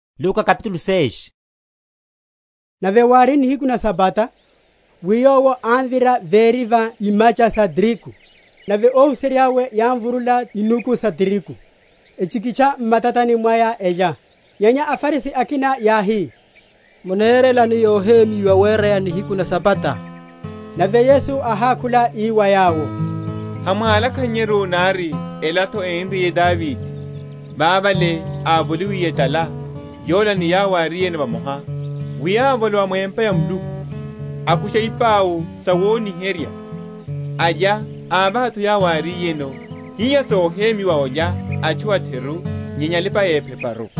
Yesu Pwiya a nihiku na Sabata. Nave wári nihiku na Sabata, wi Yowo ámvira véri va imacha sa tirigu; nave óhuserya’we yámvurula inuku sa tirigu, echikitcha m’matani mwaya, elya. Nyenya aFarisi akina yáhi, munerelani yohemyiwa wereya nihiku na Sabata? Nave Yesu áhákhula ii wa yawo, Hamwálakhannyeru nari ela’tho énriye Davide, vavale ávoliwiye etala, yola ni yawo yárino vamoha; wi ávolowa mu empa ya Muluku, akusha ipau sawoniherya, alya, avaha’tho wa yawo áriyeno; hiha sohemyiwa olya atchu a’theru nyenya alipa‐epheparu?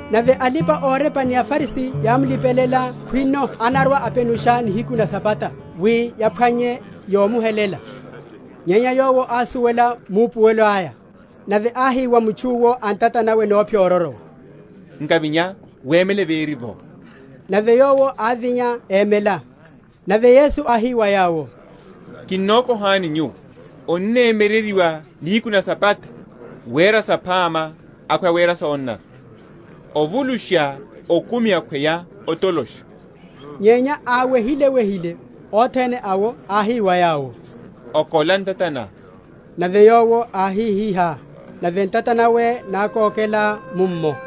Nave alipa‐orepa ni aFarisi yámlipelela khwino anarwa‐apenusha nihiku na Sabata; wi yaphwanye yomuhelela. Nyenya Yowo ásuwela maupuwelo aya; nave áhi wa mutchu’wo a ntata nawe nóphyororowa, Nkavinya, wemele véri’vo. Nave yowo ávinya, émela. Nave Yesu áhi wa yawo, Kinokohani nyuwo, onnemyereryiwa nihiku na Sabata, wera saphama, akhweya wera sonanara? ovulusha okumi akhweya otolosha? Nyenya áwehile‐wehile othene awo, áhi wa yowo, Okola ntata ná. Nave yowo áhihihá, nave ntata nawe nákokela mummo.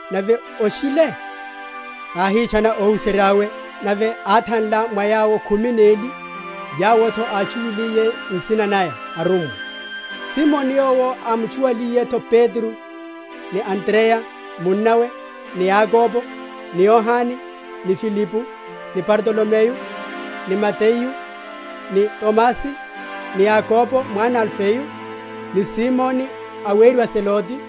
Nave oshile, áhitchana óhuserya’we; nave áthanla mwa yawo khumi neli, yawo’tho átchuwaliye nsina naya arummwa: Simoni, yowo ámutchuwaliye’tho Petro, ni Andreya munnawe, ni Yakobo, ni Yohane, ni Filipo, ni Bartolomeyo, ni Mateyu, ni Tomasi, ni Yakobo mwana a Alifeyo, ni Simoni aweriwa Zelote,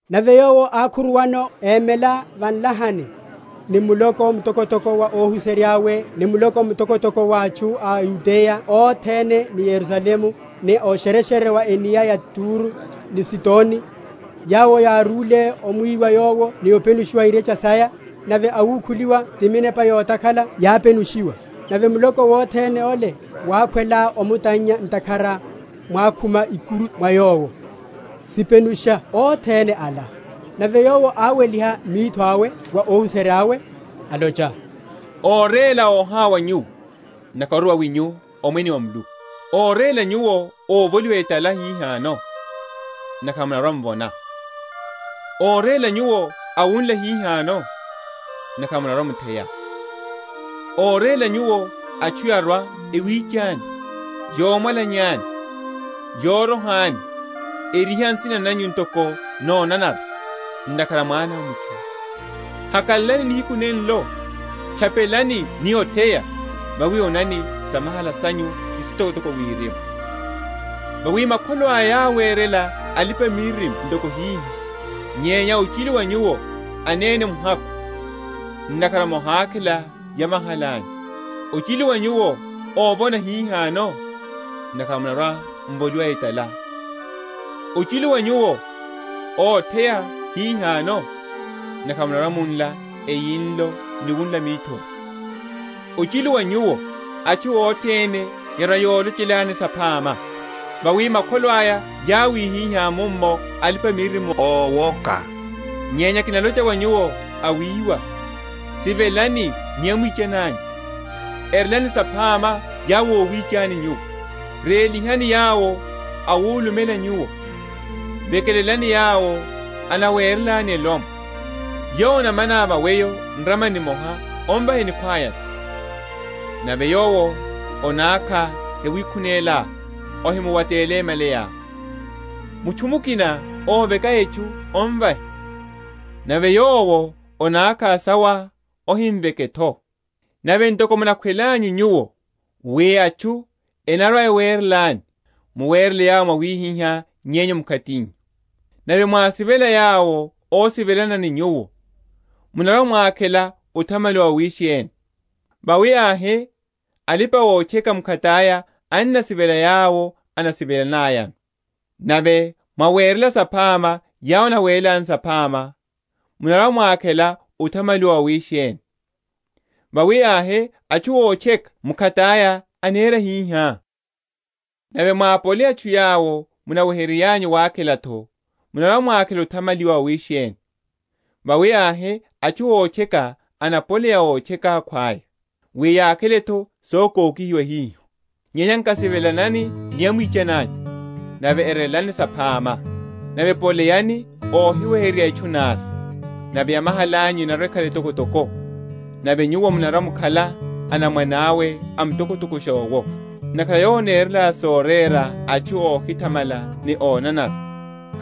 Nave Yowo ákhuruwano, émela va nlahani ni muloko mtokotoko wa óhuserya’we ni muloko mtokotoko wa atchu a o Yudeya othene ni Yerusalemu, ni a o’shereshere wa cnia ya o Turo ni Sidoni, yawo yárúle omwiwa Yowo ni openushiwa irecha saya; nave awukhuliwa ti minepa yotakhala yápenushiwa, nave muloko wothene ole wákhwela omutannya; ntakhara mwákhuma ikuru mwa Yowo, sipenusha othene ala. Nave Yowo áweliha mitho awe wa óhuserya’we alocha, Óréla óhawa nyuwo; ntakhara ori wawinyu omwene wa Muluku. Óréla nyuwo óvoliwa etala hihano; ntakhara munarwa‐m’vona. Óréla nyuwo awunla hihano; ntakhara munarwa‐mutheya. Óréla nyuwo, atchu yarwa‐ewichani, yomwalanyani, yorohani, eriha nsina nanyu ntoko nonanara, ntakhara a Mwana a mutchu. Hakalalani nihiku nenlo, tchapelani ni otheya; vawi onani, samahala sanyu ti sitokotoko Wirimu; vawi makholo aya yáwerela alipa‐miririmo ntoko hiho. Nyenya ochilu wa nyuwo anene muhakhu! ntakhara mohakhela yohakalaliha’nyu. Ochilu wa nyuwo óvona hihano! ntakhara munarwa‐m’voliwa etala. Ochilu wa nyuwo, ótheya hihano; ntakhara munarwa‐munla eyinlo ni wunla mithori. Ochilu wa nyuwo, atchu othene yarwa‐yolochelani saphama! vawi makholo aya yáwihihá mummo alipa‐miririmo ówoka. Nyenya kinalocha wa nyuwo awiwa, Sivelanani ni amwichani anyu; erelani saphama yawo awicha nyuwo, rélihani yawo awulumela nyuwo, vekelelani yawo enawerelani clomwe. Yowo anomana weyo va nramani nimoha omvahe nikhwaya’tho; nave yowo anákha yawikhunelá, ohimuwatele malayá. Mutchu mukina óveka etchu, omvahe; nave yowo anákha sawá, ohimveke’tho. Nave ntoko munakhwelelanyu nyuwo wi atchu enarwa‐ewerelani, muwerele yawo mwawihihá yenyu mkhatinyu. Nave mwasivela yawo ósivelana ni nyuwo, munarwa‐mwakhela othamaliwa wawisheni? vawi ahe alipa‐otcheka mkhataya enasivela yawo enasivelanayano. Nave mwawerela saphama yawo enawerelani saphama, munarwa‐mwakhela othamaliwa wawisheni? vawi ahe atchu ótcheka mkhataya enera hihá. Nave mwápoleya atchu yawo munaweheryanyu wakhela’tho, munarwa‐mwakhela othamaliwa wawisheni? vawi ahe atchu ótcheka ennapoleya ótcheka akhwaya, wi yakhele’tho sokokihiwa hiho. Nyenya nkasivelanani ni amwichani anyu, nave erelani saphama, nave poleyani óhiweheryerya etchu nari; nave yamahala’nyu enarwa‐ekhala etokotoko, nave nyuwo munarwa‐mukhala anamwane awe a Mtokotokosha owo; ntakhara Yowo anerela sorera atchu óhithamala ni ónanara.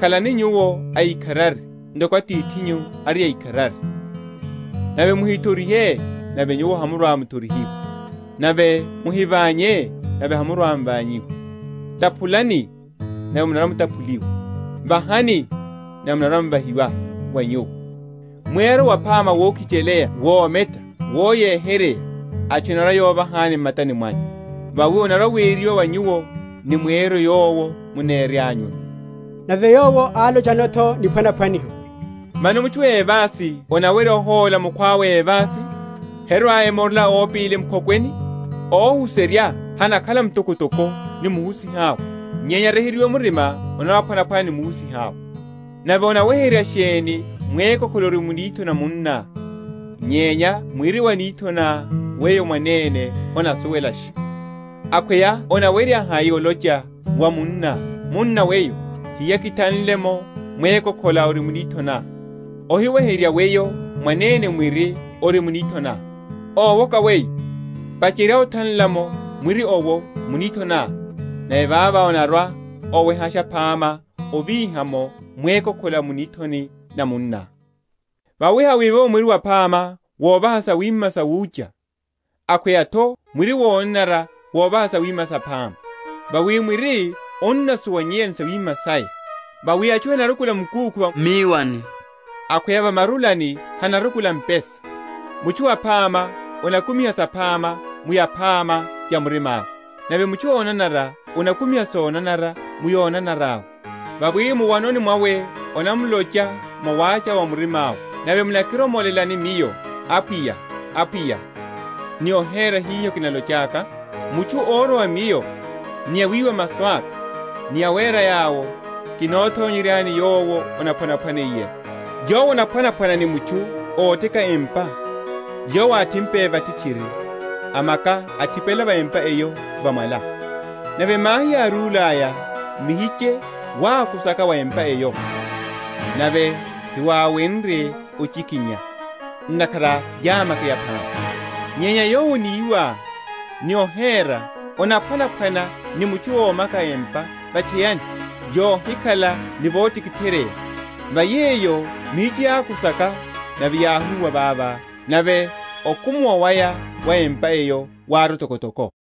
Khalani nyuwo aikharari ntoko Atithinyu ari aikharari. Nave muhithorihe, nave nyuwo hamurwa‐muthorihiwa. Nave muhivanye, nave hamurwa‐m’vanyihiwa. Taphulani, nave munarwa‐mutaphuliwa. Vahani, nave onarwa‐ovahiwa wa nyuwo; mweryo waphama wokhicheleya wometa woyeheryeya, atchu enarwa‐yovahani m’matani mwanyu. Vawi onarwa‐weryiwa wa nyuwo ni mweryo yowo muneryanyuno. Nave Yowo álochano’tho niphwanaphwaniho, Mano mutchu évasi anawerya ohóla mukhwawe évasi? herwa‐emorela ópili mu’khokweni? Óhuserya hanakhala mtokotoko ni muhusiha’we; nyenya, aryeheryiwe murima, anarwa‐aphwanaphwana ni muhusiha’we. Nave onaweherya sheni mwékokhola ori mu nithoni na munná, nyenya mwiri wa mu nithoni na weyo mwanene honasuwelasha? Akhweya onawerya hai olocha wa munná, Munna weyo, hiya kithanle’mo mwékokhola ori mu nithoni ná, ohiweherya weyo mwanene mwiri ori mu nithoni ná? Ówoka weyo! pacherya othanla’mo mwiri owo mu nithoni ná, nave vavo onarwa‐owehasha phama ovíha’mo mwékokhola a mu nithoni na munná. Vawi hawivovo mwiri waphama wovaha sawima sawúcha; akhweya’tho mwiri wonanara wovaha sawima saphama. Vawi mwiri onasuwanyeya ni yawima’ya. Vawi atchu henarukula makúkhu va míwani, akhweya va marulani hcnarukula mpesa. Mutchu aphama anakumiha saphama mu yaphama ya murima’we; nave mutchu ónanara anakumiha sonanara mu yonanara’we: vawi muwanoni mwawe anamlocha mwa wacha wa murima’we. Nave munakiromolelani Miyo, Apwiya, Apwiya, ni ohera hiho kinalochaka? Mutchu órwa wa Miyo, ni wiwa masu aka, ni wera yawo, kinothonyeryani yowo anaphwanaphwaniyeno. Yowo anaphwanaphwana ni mutchu óteka empa, yowo áthimpe vathi tchiri, amaka othipela wa empa eyo va mwala: nave mahi yárúlaya, muhiche wákusaka va empa eyo, nave hiwáwenrye ochikinya; ntakhara yámakeya phama. Nyenya yowo aníwa, ni ohera, anaphwanaphwana ni mutchu ómaka empa va’tchayani, yohikhala ni votikitheryeya; va yeyo muhiche wákusaka, nave yáhúwa vavo; nave okumuwa waya wa empa eyo wári otokotoko.